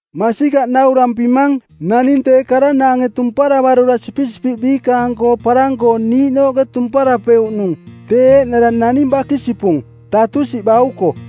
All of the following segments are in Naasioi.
“Masikaꞌ naurampimang, naning tee karanaange tumparavarura sipisipiꞌ biikaang-koo parang-koo niiꞌnooꞌke tumparapeuꞌnung tee eeꞌnara naning bakisipung, tatusiꞌ bauko.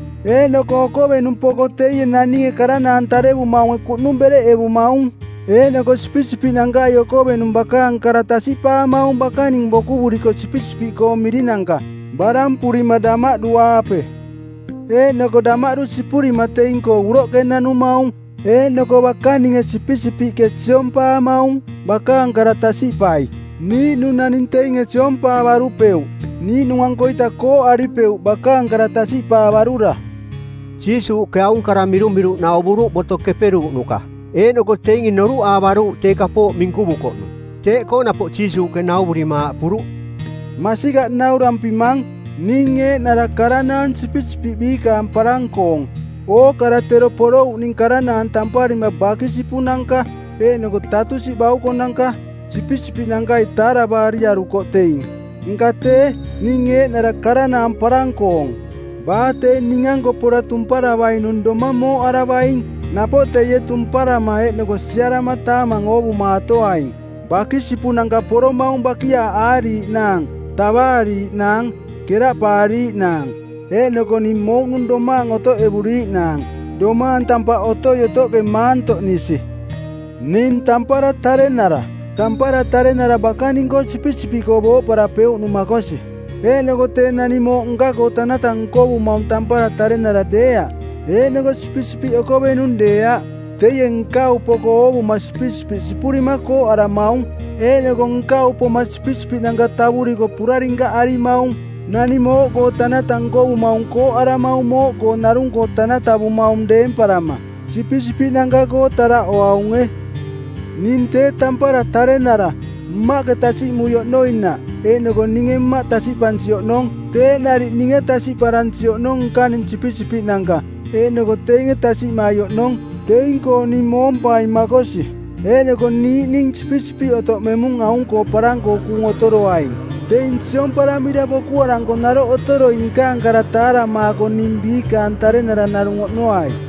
Eeꞌnoko okovenung poko teie naninge karanaang tarevumaunge kuꞌnung bereꞌevumaung. Eeꞌnoko sipisipiꞌnankai okovenung bakaang kara tasiꞌpaamaung bakaning bokuvuriko sipisipiꞌkoong mirinanka, barampurima damaꞌdu-aape. Eeꞌnoko damaꞌdu sipurima teing-koo uroꞌke nanumaung. Eeꞌnoko bakaninge sipisipiꞌke siompaamaung, bakaang kara tasiꞌpai. Niiꞌnung naning teinge siompaavarupeuꞌ. Niiꞌnung-ankoita kooꞌaripeuꞌ bakaang kara tasiꞌpaavarura.” Jiisuuꞌke aung kara mirumiruꞌ nauvuruꞌ Boto Keperuuꞌnuka, eeꞌnoko teinge noruꞌaavaruuꞌ tee kapooꞌ minkuvukoꞌnung. Teeꞌkoo napoꞌ Jiisuuꞌke nauvurima aaꞌpuruꞌ, “Masikaꞌ naurampimang, ning eeꞌnara karanaang sipisipiꞌ biikaang parang-koong. Ookara tero porouꞌning karanaang tamparima bakisipunanka eeꞌnoko tatusiꞌ baukonanka. Sipisipiꞌnankai taaravaariarukoꞌ teing. Nka tee, ning eeꞌnara karanaang parang-koong. Baa tee ning-anko pora tumparavainung domang mooꞌaravaing. Napoꞌ teie tumparama eeꞌnoko siarama taamang oovumatoaing. Bakisipunanka poromaung bakiaaꞌaariiꞌnaang, tavaariiꞌnaang, keraꞌpaariiꞌnaang. Eeꞌnoko ning mouꞌnung domaang otoꞌevuriiꞌnaang, domaang tampaꞌ otoi-otoꞌke maantoꞌnisi. Ning tampara tarenara. Tampara tarenara bakaning-koo sipisipiꞌkoo booꞌparapeuꞌnung makosi. Eeꞌnoko tee naning mooꞌ nka-koo tanata nkovumaung tampara tarenara deeaꞌ eeꞌnoko sipisipiꞌ okovenung deeaꞌ. Teie nkau poko oovuma sipisipiꞌ sipurima kooꞌaramaung. Eeꞌnoko nkau poma sipisipiꞌnanka tavuriko purarinkaꞌarimaung. Naning mooꞌkoo tanata nkovumaung kooꞌaramaung mooꞌkoo narung-koo tanatavumaung deemparama. Sipisipiꞌnanka-koo taraꞌoaunge. Ning tee tampara tarenara; Mmaꞌke tasiꞌmui oꞌnoinaꞌ eeꞌnoko ninge Mmaꞌ tasiꞌpansi oꞌnong, teeꞌ nariꞌ ninge tasiꞌparansi oꞌnong nkaning sipisipiꞌnanka eeꞌnoko teinge tasiꞌmai oꞌnong. Teing-koo ning moompaing makosi. Eeꞌnoko niiꞌning sipisipiꞌ otoꞌmemung aung-koo parang-koo kuung otoroaing. Teing siomparamira bokuaranko naroꞌ otoroi nkaang kara taaramaako ning biikaang tarenara narung oꞌnoai.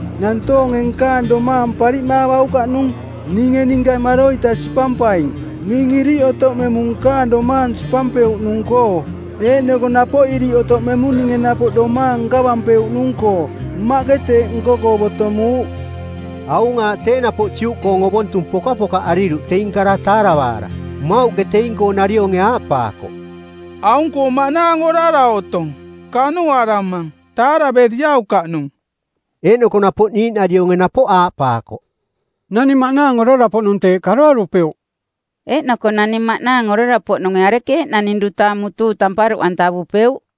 Nantoonge nkaang domaang pariꞌmaavaukaꞌnung. Ninge ninka maroita sipampaing. Ning iriꞌ otoꞌmemung nkaang domaang sipampeuꞌnung-koo, eeꞌnoko napoꞌ iriꞌ otoꞌmemung ninge napoꞌ domaang nkavampeuꞌnung-koo. Mmaꞌke teeꞌ nko-koo botomuuꞌ.” Aung aaꞌ tee napoꞌ Juꞌkoong ovontung pokapokaꞌariruꞌ teing kara taaravaara. Mmauꞌke teing-koo narionge aaꞌpaakoꞌ, “Aung-koo maꞌnaang orara otong. Kanuꞌaramang. Taaraveriaukaꞌnung.” Eeꞌnoko napoꞌ niiꞌnarionge napoꞌ aaꞌpaakoꞌ, “Naning maꞌnaang orara-poꞌnung teeꞌ karoarupeuꞌ. Eeꞌnoko naning maꞌnaang orara-poꞌnunge arekeeꞌ naning duta mutuu tamparuꞌantavupeuꞌ?”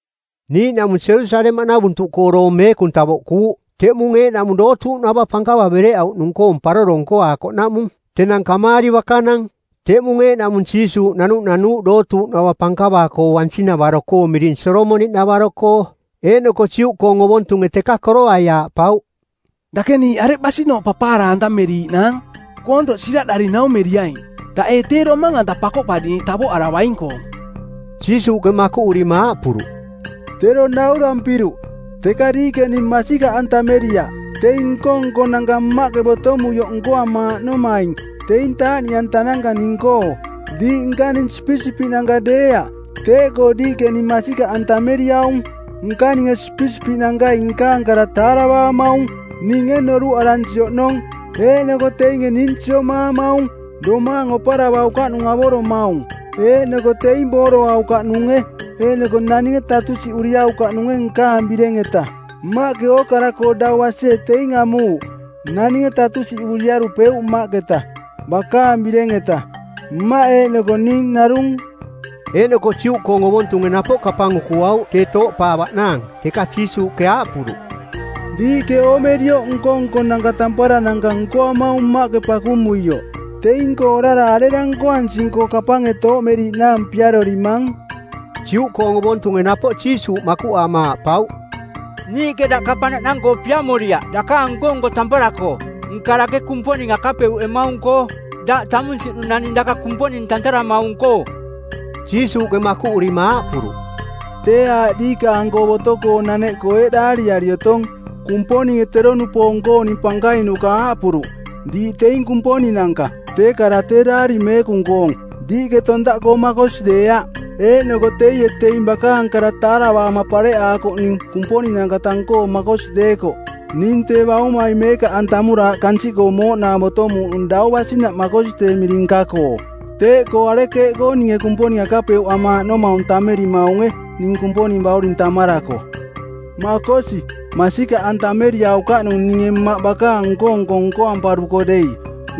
Niiꞌnaꞌmung Jerusalemaꞌnavuntuꞌkoo doong meekung tavoꞌkuuꞌ, teꞌmung eeꞌnaꞌmung dootuuꞌnava pankava bereꞌauꞌnaꞌmung-koong paroro nkoaakoꞌnaꞌmung. Tenang kamaari bakanang. Teꞌmung eeꞌnaꞌmung Jiisuuꞌ nanuꞌnanuuꞌ dootuuꞌnava pankava-koo bansing-navaro-koo miring Solomoniꞌnavaro-koo. Eeꞌnoko Juꞌkoong ovontunge teka koroai aaꞌpauꞌ, “Dake niiꞌ areꞌ basinooꞌ papaara-antameriiꞌnaang? Koontoꞌ siraꞌdari naumeriaing. Daꞌ ee tee Domang-anta Pakoꞌpariꞌniiꞌ tavoꞌaravaing-koong?” Jiisuuꞌke makuꞌurima aaꞌpuruꞌ, “Tero naurampiruꞌ, teka diiꞌke ning masikaꞌantameriaꞌ. Teing nko-nkonanka Mmaꞌke botomuioꞌ nkoamaaꞌnomaing teing taaꞌniꞌantananka ning-koo. Diiꞌ nkaning sipisipiꞌnanka deeaꞌ, teeꞌkoo diiꞌke ning masikaꞌantameriaung. Nkaninge sipisipiꞌnankai nkaang kara taaravaamaung, ninge noruꞌaransi oꞌnong, eeꞌnoko teinge ning siomaamaung. Domaang oparavaukaꞌnung avoromaung, eeꞌnoko teing booroaukaꞌnunge, eeꞌnoko naninge tatusiꞌuriaukaꞌnunge nkaang bireng-eta. Mmaꞌke ookara-koo dau basie teing amuuꞌ. Naninge tatusiꞌuriarupeuꞌ Mmaꞌketa, bakaang bireng-eta. Mmaꞌ eeꞌnoko ning narung.” Eeꞌnoko Juꞌkoong ovontunge napoꞌ kapang ukuauꞌ tee tooꞌpaavaꞌnaang. Teka Jiisuuꞌke aaꞌpuruꞌ, “Diiꞌke oomerioꞌ nko-nkonanka tamparananka nkoamaung Mmaꞌke pakumuioꞌ. Teing-koo orara arera nkoansing-koo kapange tooꞌmeriiꞌnaang piarorimang?” Juꞌkoong ovontunge napoꞌ Jiisuuꞌ makuꞌaama aaꞌpauꞌ, “Niiꞌke daꞌ kapang naꞌnang-koo piamoriaꞌ dakaang nko-nko tampara-koo, nka dake Kumponing akapeuꞌemaung-koo, daꞌ tamunsiꞌnung naning daka Kumponing tantaramaung-koo.” Jiisuuꞌke makuꞌurima aaꞌpuruꞌ, “Tee aaꞌ diikaang-koo boto-koo naneꞌkoo eeꞌ daariari otong, Kumponinge tero-nupoong-kooning pankainuka aaꞌpuruꞌ, ‘Diiꞌ teing kumponinanka.’ Tee kara tee Daari Meekung-koong, diiꞌke tontaꞌkoo makosi deeaꞌ. Eeꞌnoko teie teing bakaang kara taaravaama pareꞌaakoꞌning kumponinanka tang-koo makosi deekoꞌ ning tee Baumai meekaꞌantamura aꞌ kansiꞌkoo mooꞌnaang botomuuꞌnung dau basinaꞌ makosi tee miring nka-koo; Teeꞌkoo arekeeꞌkoo ninge Kumponing akapeuꞌamaaꞌnomaung tammerimaunge ning Kumponing Bauring tammarako? Makosi, masikaꞌantameriaukaꞌnung ninge Mmaꞌ bakaang nko-nko nkoamparuko dei.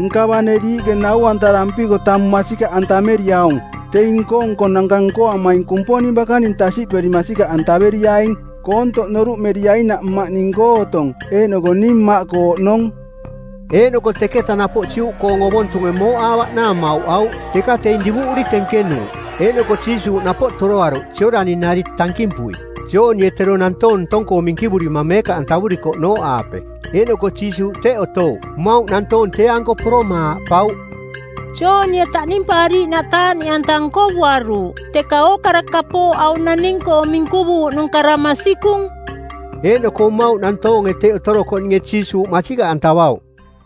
Nka bane diiꞌke nau-antarampiko tamung masikaꞌantameriaung, teing nko-nkonanka nkoamaing Kumponing bakaning tasiꞌperi masikaꞌantaveriaing, koontoꞌ noruꞌmeriainaꞌ Mmaꞌ ning-koo otong eeꞌnoko ning Mmaꞌkoo oꞌnong.” Eeꞌnoko teketa napoꞌ Juꞌkoong ovontunge mooꞌaavaꞌnaang mauꞌauꞌ, teka teing divuꞌuri tenkenuuꞌ. Eeꞌnoko Jiisuuꞌ napoꞌ toroaruꞌ Jooꞌdani-nari tankimpui Joonie tero nantoong ntong-koo minkivurima meekaꞌantavurikoꞌnooꞌaape. Eeꞌnoko Jiisuuꞌ teꞌ otouꞌ. Mmauꞌ nantoong tee-anko poroma aaꞌpauꞌ, “Joonie taꞌnimpaariiꞌnaꞌ taaꞌniꞌanta nkovuaruuꞌ, teka ookara kapooꞌ aung naning-koo minkuvuuꞌnung kara masikung.” Eeꞌnoko mmauꞌ nantoonge teꞌ otorokoꞌninge Jiisuuꞌ masikaꞌantavauꞌ.